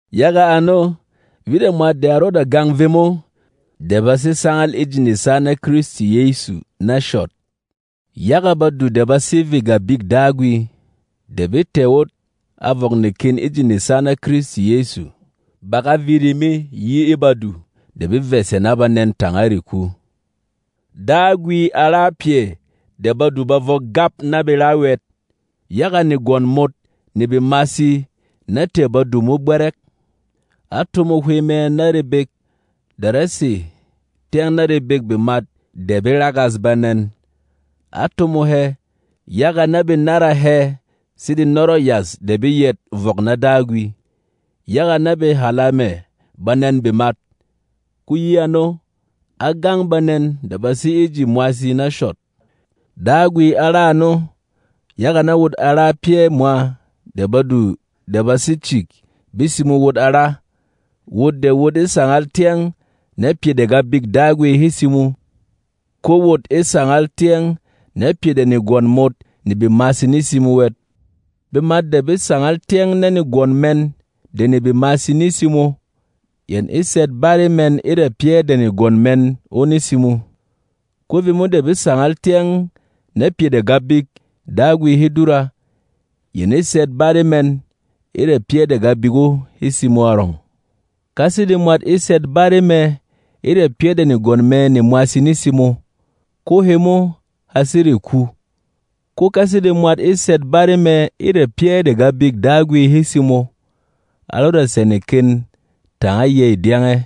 Yaga ano, vit a mwat de a rɔda gang vemo de ba sé sangal e ji nesa na Kristi Yɛsu na shɔt. Yaga badu de ba sé vê Gabik Dagwi, de be tɛ̀ wot a vɔk neken e ji nesa na Kristi Yɛsu, ba ga viri me yi e badu de be vɛ̀sɛ na banɛn tanga reku. Dagwi á ra pyɛ de badu ba vɔk gap na be ra wɛt, yaga negwɔn mot ne bemasi ná tɛ̀ badu mo gbɛrɛk. Á tomo Hwey mɛ na rebek de rá sè tyɛng na rebêk bemat de be ragas banɛn. Á tomo hɛ, yaga na be nára hɛ̄ sede nɔrɔ̂ yas de be yɛt vɔk na Dagwi, yaga na be hàla mɛ̀ banɛ̂n bemat. Ko yi ano, á gang banɛn de ba sé e ji mwasi na shɔt. Dagwi á ra ano, yaga na wot a ra pyɛ̂ mwa de badu de ba sé cik be simo wot a ra, wot de wot e sangal tyɛng na pyɛ de Gabik Dagwi he simo, ko wot e sangal tyɛng na pyɛ de negwɔn mot ne bemasi ne simo wɛt. Bemat de be sangal tyɛng na negwɔn mɛn de ne bemasi ne simo, yɛn e sɛt báre mɛn e ra pyɛ́ de negwɔn mɛn o ne simo. Ko vemo de be sangal tyɛng na pyɛ de Gabik Dagwi he dura, yɛn e sɛt báre mɛn e ra pyɛ́ de Gabik o he simo arɔng. Ka sede mwat e sɛt báre mɛ e ra pyɛ́ de negwɔn mɛ ne mwasi ne simo, ko hemo ha sé reku. Ko ka sede mwat e sɛt báre mɛ e ra pyɛ́ de Gabik Dagwi he simo, a rɔda sɛ̀ neken tanga yêy dyɛngɛ.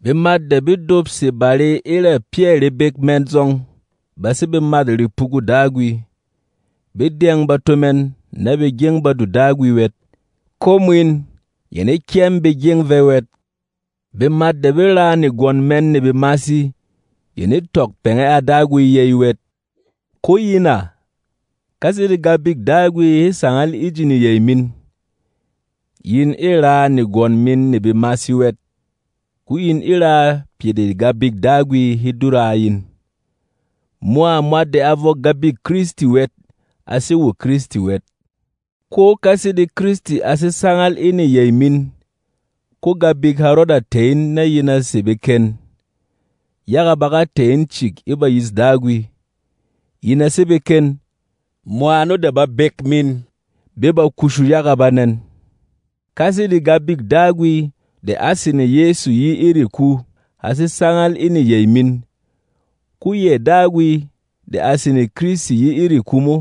Bemat de be dopse bare e ra pyɛ̂ rebek mɛn zɔng ba sé bemât repugû Dagwi. Be dyɛng bato mɛn na be gyeng badu Dagwi wɛt, ko mwin, yɛn e kyɛm be gyeng vɛ wɛt. Bemat de be raa negwɔn mɛn ne bemasi yɛn e tɔk pɛngɛ a Dagwi yey wɛt. Ko yin à, ka sede Gabik Dagwi he sangal e ji neyey min, yin e raa negwɔn min ne bemasi wɛt, ko yin e raa pyɛ de Gabik Dagwi he dura a yin. Mwa mwat de a vɔk Gabik Kristi wɛt a sé wo Kristi wɛt. Ko ka sede Kristi a sé sangal e neyey min, ko Gabik ha rɔda tɛ̀ in na yin a sè beken, yaga ba ga tɛ̀ in cik e bayîs Dagwi. Yin a sé beken, mwa ano de babek min be ba kushu yaga banɛn. Ka sede Gabik Dagwi de á sene Yɛsu yi e reku ha sé sangal e neyey min, ko yɛ Dagwi de a sene Kristi yi e reku mo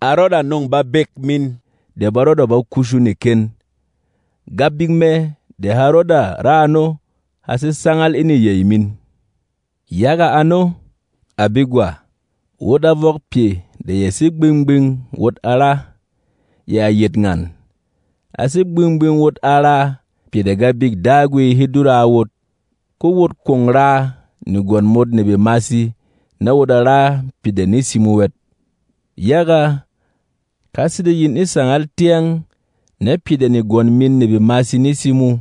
a rɔda nɔ̂ng babek min de ba rɔda ba kushu neken. Gabik mɛ de ha rɔda ra ano ha sé sangal e neyey min. Yaga ano, à begwa, wot a vɔk pyɛ de ya sé gbing-gbing wot a ra, yɛ a yet ngan: A sé gbing-gbing wot a raa pyɛ de Gabik Dagwi he dura a wot, ko wot kwon raa negwɔn mot ne bemasi na wot a ra pyɛ de ne simo wɛt. Yaga, ka sede yin e sangal tyɛng na pyɛ de negwɔn min ne bemasi ne simo,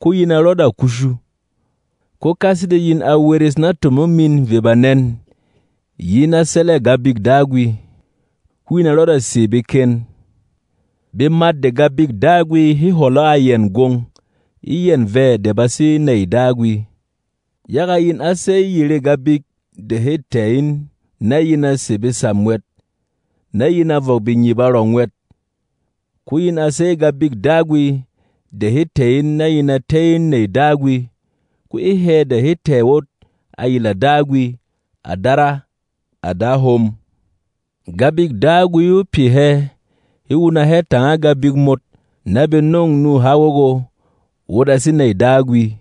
ko yin a rɔda kushu. Ko ka sede yin a weres na tomong min ve banɛn yi na sɛlɛ̂ Gabik Dagwi, ko yin a rɔda sè beken. Bemat de Gabik Dagwi he hwɔlɔ a yɛn gwong, e yɛn vɛ de ba sé nèy Dagwi. Yaga yin á sey yerê gabik de he tɛ̀ in na yin a sè besam wɛt, na yin a vɔk bengyip arɔng wɛt. Ko yin a sey Gabik Dagwi de ha tɛ̀ in na yin a tɛ́ in nèy Dagwi. Ko e hɛ de he tɛ̀ wot a yila Dagwi, “À Dara, à Da hom!” Gabik Dagwi o pyɛ hɛ he wuna hɛ tanga gabik mot na be nɔng nuha wɔgɔ, wot a sé nèy Dagwi.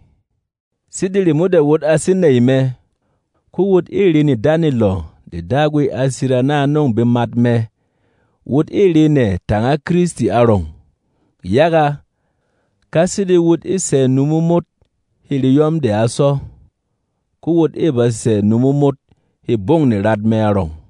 Sede remo de wot a sé nèy mɛ, ko wot ê re nedanelɔ de Dagwi a sira na a nɔ̂ng bemat mɛ. Wot ê re nɛ tanga Kristi arɔng. Yaga, ka sede wot e sɛ̀ numo mot hê reyɔm de a sɔ, ko wot ê ba sɛ̀ numo mot hê gbɔng nerat mɛ arɔng.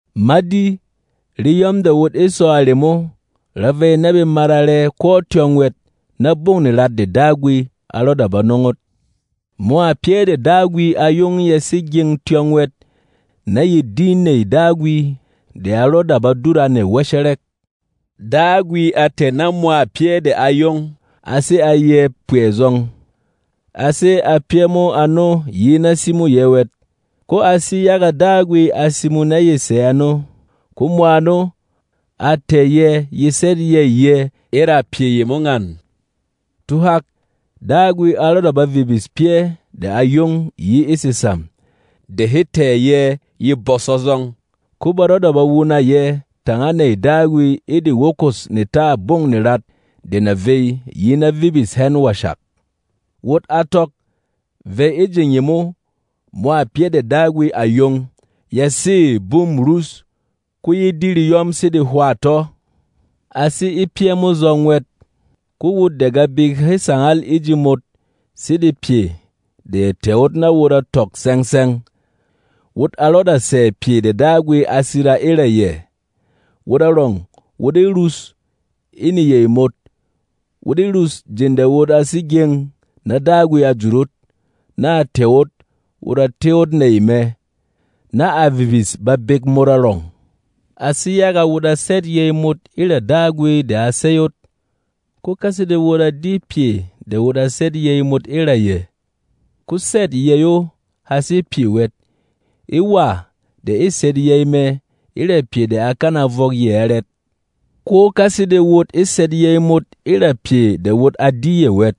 Ma di, reyɔm de wot e sɔ a remo ra vey na be mara rɛ ko tyɔng wɛt na gbɔng nerat de Dagwi a rɔda ba nɔng ot. Mwa pyɛ́ de Dagwi a yong ya sé gyeng tyɔng wɛt na ye di nèy Dagwi de a rɔda ba dura nɛ wɛshɛrɛk. Dagwi a tɛ̀ na mwa pyɛ́ de a yong a sè a yɛ̄ kpɛɛ zɔng. A sé a pyɛ́ mo ano yi na simô yɛ̄ wɛt, ko a sé yaga Dagwi a simo na ye sè ano. Ko mwa ano, a tɛ̀ yɛ̄ ye sɛt yey yɛ̄ e ra pyɛ yemo ngan: Tuhak, Dagwi a rɔda ba vibis pyɛ́ de à yong yi e sesam de he tɛ̀ yɛ̄ ye bɔsɔ zɔng. Ko ba rɔda ba wuna yɛ̄ tanga nèy Dagwi e de wokos netâ gbɔng nerat de na vey yi na vibis hɛn washak. Wot a tɔk, vey e jeng yemo, mwa pyɛ́ de Dagwi à yong ya sê bûm rus, ko ye di reyɔm sede hwâ tɔ́. A sé e pyɛ́ mo zɔng wɛt, ko wot de Gabik he sangal e ji mot sede pyɛ de ya tɛ̀ ot na wot a tɔk tsɛng-tsɛng, wot a rɔda sɛ̀ pyɛ de Dagwi a sira e ra yɛ, wot arɔng wot e rus e neyey mot. Wot e rus jeng de wot a sé gyeng na Dagwi a jut ot, na a tɛ̀ ot wot a tɛ́ ot nèy mɛ, na a vibis babek mot arɔng. A sé yaga wot a sɛt yey mot e ra Dagwi de a sey ot. Ko ka sede wot a di pyɛ de wot a sɛt yey mot e ra yɛ, ko sɛ̂t yey o ha sé pyɛ wɛt. E wà de e sɛt yey mɛ e ra pyɛ de a kana vɔk yɛ arɛt? Ko ka sede wot e sɛt yey mot e ra pyɛ de wot a di yɛ wɛt,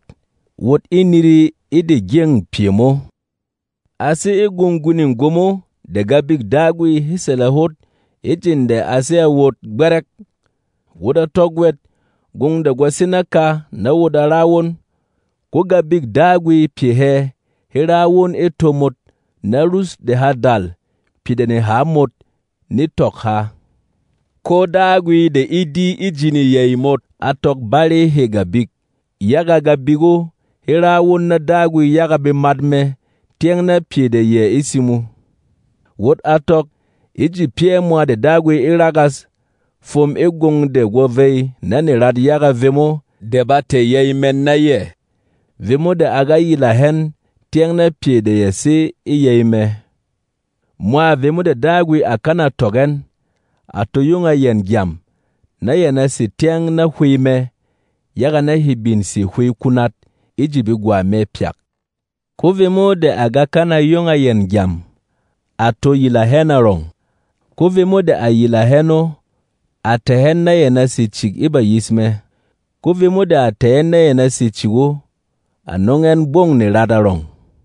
wot e niri e de gyeng pyɛ mo. A sé e gwong gwining gwomo de Gabik Dagwi he sɛlɛ hot e jeng de a sé a wot gbɛrɛk. Wot a tɔk wɛt gwong de gwa sé naka na wot a ra won; ko Gabik Dagwi pyɛ hɛ he ra won e to mot na rus de ha dal pyɛ de neha mot ne tɔk ha. Ko Dagwi de e di e ji neyey mot a tɔk báre hê Gabik. Yaga Gabik o he ra won na Dagwi yaga bemat mɛ tyɛng na pyɛ de yɛ e simo. Wot a tɔk, e ji pyɛ̂ mwa Dagwi e ragas fwom e gwong de gwo vey na nerat yaga vemo de ba tɛ̀ yey mɛn na yɛ, vemo de a ga yila hɛn tyɛng na pyɛ de ya sé e yey mɛ. Mwa vemo de Dagwi à kana tɔk ɛn, à to yong a yɛn gyam, na yɛn a sè tyɛng na Hwey mɛ, yaga na he bin sè hwey kunat e ji begwa mɛ pyak. Ko vemo de à ga kana yong a yɛn gyam, à to yila hɛn arɔng. Ko vemo de à yila hɛn o, à tɛ̀ ɛn na yɛn a sè cik e bayis mɛ. Ko vemo de à tɛ̀ ɛn na yɛn a sè cik o, à nɔng ɛn gbɔng nerat arɔng.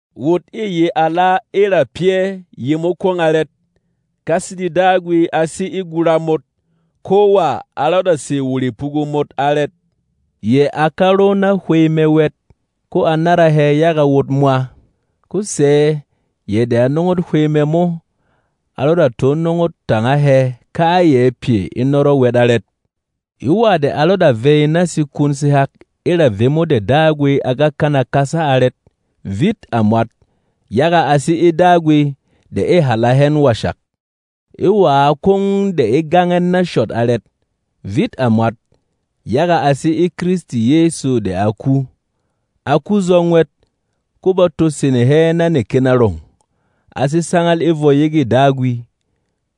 Wot ê ye ala e ra pyɛ́ yemo kwong arɛt? Ka sede Dagwi a sé e gura mot, ko wà a rɔda sè wo repugu mot arɛt? Yɛ a ka ro na Hwey mɛ wɛt, ko a nára hɛ yaga wot mwa. Ko sɛ̌ yɛ de a nɔng ot Hwey mɛ mo a rɔda to nɔng ot tanga hɛ kayɛ pyɛ e nɔrɔ wɛt arɛt? E wà de a rɔda vey na sekun sehak e ra vemo de Dagwi a ga kana kasa arɛt? Vit a mwat, yaga a sé e Dagwi de e hàla hɛn washak. E wǎ kwong de e gang ɛn na shɔt arɛt? Vit a mwat, yaga a sé e Kristi Yɛsu de a ku. A ku zɔng wɛt, ko ba to sene hɛ na neken arɔng. A sé sangal e vwɔ yegê Dagwi,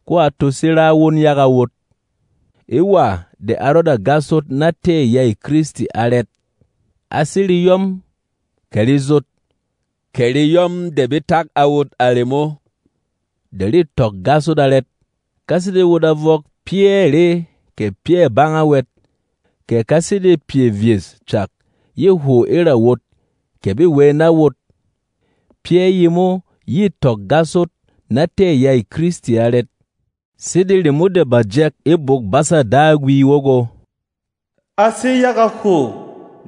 ko a to sé ra won yaga wot. E wà de a rɔda gas ot na tɛ̂ yêy Kristi arɛt? A sé reyɔm, kɛ rezot, kɛ reyɔm de be tak a wot remo de rê tɔk gas ot arɛt? Ka sede wot a vɔk pyɛ̂ re kɛ pyɛ̂ banga wɛt, kɛ ka sede pyɛ vyes cak yê hwo e ra wot kɛ bê wey na wot — pyɛ́ yemo yê tɔk gas ot na tɛ̂ yêy Kristi arɛt? Sede remo de bà jɛk e Bwok-basa Dagwi wɔgɔ, “A sé yaga hwo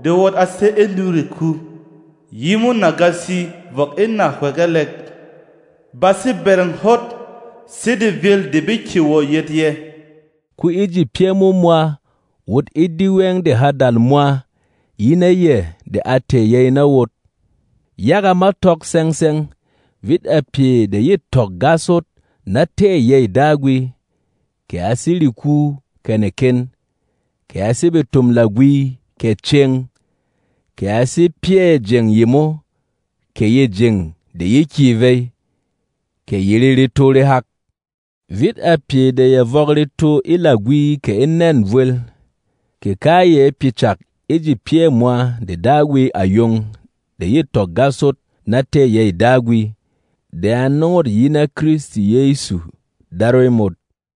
de wot a sé e nû reku yimo nagasi vɔk e nahywegelek. Ba sé bɛrɛng hot sede vyēl de be kyè wɔ̀ yɛt yɛ̄.” Ko e ji pyɛ́ mo mwa wot e di wɛng de ha dal mwa yi na yɛ̀ de a tɛ̀ yey na wot! Yaga ma tɔk tsɛng-tsɛng, vit a pyɛ de yê tɔk gas ot na tɛ̂ yêy Dagwi, kɛ a sé reku kɛ neken, kɛ a sé betom-lagwi kɛ cēng, kɛ a sé pyɛ̂ jeng yemo kɛ yê jeng de ye kyè vey, kɛ yerê reto rehak. Vit a pyɛ de ya vɔk reto e lagwi kɛ e nɛ̂n vwel, kɛ kayɛ pyɛ cak e ji pyɛ̂ mwa de Dagwi à yong de yê tɔk gas ot na tɛ̂ yêy Dagwi de a nɔng ot yi na Kristi Yɛsu, Darwey mot.